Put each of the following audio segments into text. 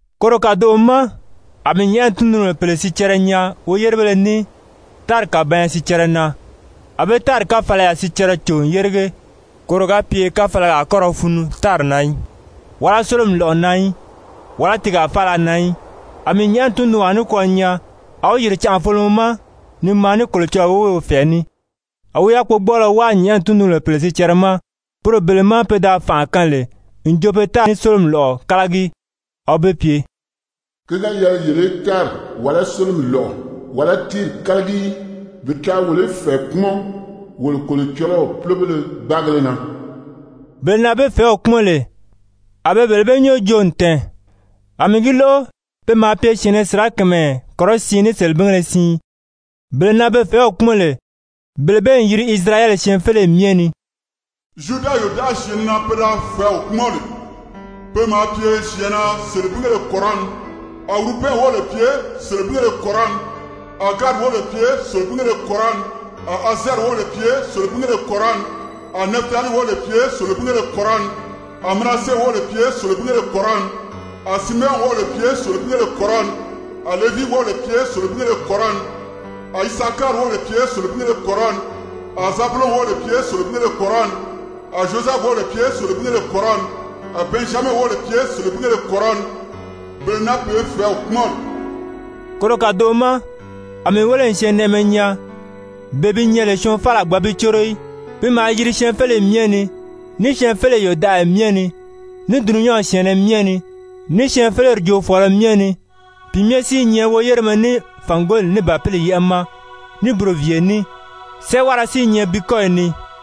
Koro kàdoʔo ma a mii nyɛ̀ʔɛni tundunbèle pèle sicɛrɛ nyaa woyérebéle ní tári kàbanya sicɛrɛ na, a be tári káfalaya sicɛrɛ cò n yérige, koro ga pye káfalaga a kɔ́ ra funu tári na í, wàlá sólomi lɔ̀ʔɔ na í, wàlá tiigaa faala na í. A mii nyɛ̀ʔɛni tundunwaa nikwɔɔ nyaa, a wi yìri canʔafolomɔ ma ni maa ní Kolocɔlɔɔ woweew fɛ̀ɛ ní. A wi yákpogbɔɔlɔ wáa nyɛ̀ʔɛni tundunbéle sicɛrɛ ma, poro bele má pe da fànʔa kaan lè n jo be tári ní sólomi lɔ̀ʔɔ kálagi. A wi be pye: «Ki ga yɛlɛ yele í tári, wàlá sólomi lɔ̀ʔɔ, wàlá tíiri kálagi í, bi taa wolo í fɛ̀ɛ kpúmɔn wolo Kolocɔlɔw púlobéle gbáagéle na.» Bele na be fɛ̀ɛ́w kpúmɔn lè, a be bele bee nyɔ́ɔ joo n tɛ̀ɛn, a mii gi lóʔo, pe maa pye syɛ̀ɛnnɛ sirakamayɛ kɔrɔsiin ní selebingéle siin, bele na be fɛ̀ɛ́w kpúmɔn lè, bele bee n yiri Isirayɛli syɛɛnfeleyi myɛ ni. Zyuda yòdaʔayi syɛ̀ɛnnɛ na pe da fɛ̀ɛ́w kpúmɔn lè, pe maa pye syɛ̀ɛnnɛ selebingéle kɔrɔni. A Wurubɛn wóbèle pye selebingéle kɔrɔni. A Gadi wóbèle pye selebingéle kɔrɔni. A Azɛɛri wóbèle pye selebingéle kɔrɔni. A Nɛfitalii wóbèle pye selebingéle kɔrɔni. A Manase wóbèle pye selebingéle kɔrɔni. A Simeyɔn wóbèle pye selebingéle kɔrɔni. A Levii wóbèle pye selebingéle kɔrɔni. A Isakari wóbèle pye selebingéle kɔrɔni. A Zabulɔn wóbèle pye selebingéle kɔrɔni. A Zyozɛfu wóbèle pye selebingéle kɔrɔni. A Bɛnzyamɛ wóbèle pye selebingéle kɔrɔni, bele na be fɛ̀ɛ́w kpúmɔn lè. Koro kàdoʔo ma a mii wéle n syɛɛnnɛʔɛmɛ nyaa, bee bi nyɛ lè syɔɔn faala a gbǎn bi córo í, pi maa yiri syɛɛnfeleyi myɛ ni, ní syɛɛnfeleyi yòdaʔaya myɛ ni, ní dulunyanw syɛ̀ɛnnɛ myɛ ni, ní syɛɛnfeleri joofɔɔlɔ myɛ ni. Pi myɛ si i nyɛ woyéremɛ ní fàngoli ní Bàpili yɛ́ʔɛ ma ní buroviiye ní, sɛ́ʔɛwara si i nyɛ bi kɔ́yi ni.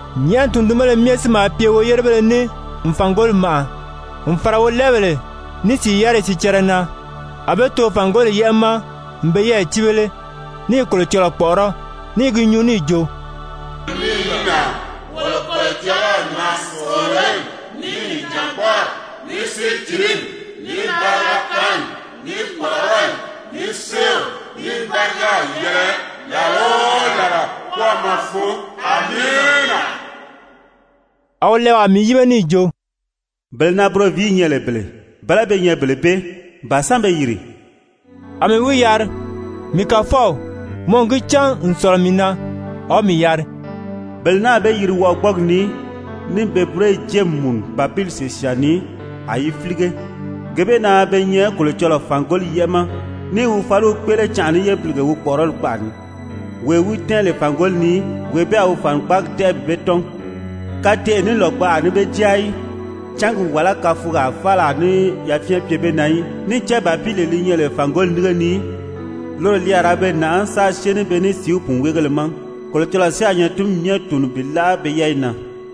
Nyɛ̀ʔɛni tundunbéle myɛ si maa pye woyérebéle ní n fàngoli màʔa, n fàra wolɛɛbèle ní sìi yáriyi sicɛrɛ na. A be too fàngoli yɛ́ʔɛ ma n be yɛ́ɛyi cíbele ní i Kolocɔlɔɔ kpɔ̀ʔɔrɔ́, ní i gi nyuu níì jo: «Amiina. Wolo Kolocɔlɔw na sòololi, ní nìjangbɔɔri, ní sícilimi, ní bariga kaanni, ní kpɔ̀ʔɔrɔli, ní séew, ní bárigaw yɛlɛ làla o làla kwɔ́ɔmɔ fun! Amiina.» A wolɛɛwaa mii yíbe níì jo: «Bele na buroviiyi nyɛ lè bele, bɛ̀lɛ́ be nyɛ bele bee? Ba sán be yìri?» A mii wi yari: «Mii Kàfɔw, mɔ n gi cán n sɔ̀lɔ mii na.» A wi mii yari: «Bele naa be yiri wɔʔɔgbɔɔgi ni níì pe búroyi jée n mùnu Bàpili sìsyaan ni, a yi fílige. Gee bee na be nyɛ Kolocɔlɔɔ fàngoli yɛ́ʔɛ ma, ní i wi fáliw kpéʔele canʔa ní yébilige wi kpɔ̀ʔɔrɔli kpaʔa ni. Wee wi tɛ́ɛn lè fàngoli ni, wee bee a wi fànikpaagi tɛ́ʔɛ bi be tɔ́n. Kateʔe ní lògbaʔa a ní be jáa í, cángi wàlá káfugaa faala a ní yafyɛn pye be na í. Níì cán Bàpilee li nyɛ lè fàngoli nínge ni, loro li a ra be nàʔá, sáā syée ní be ní sìíw pùnweegéle ma, Kolocɔlɔɔ si a nyatinmi myɛ tùuni bi láʔa pe yɛ́ɛyi na.»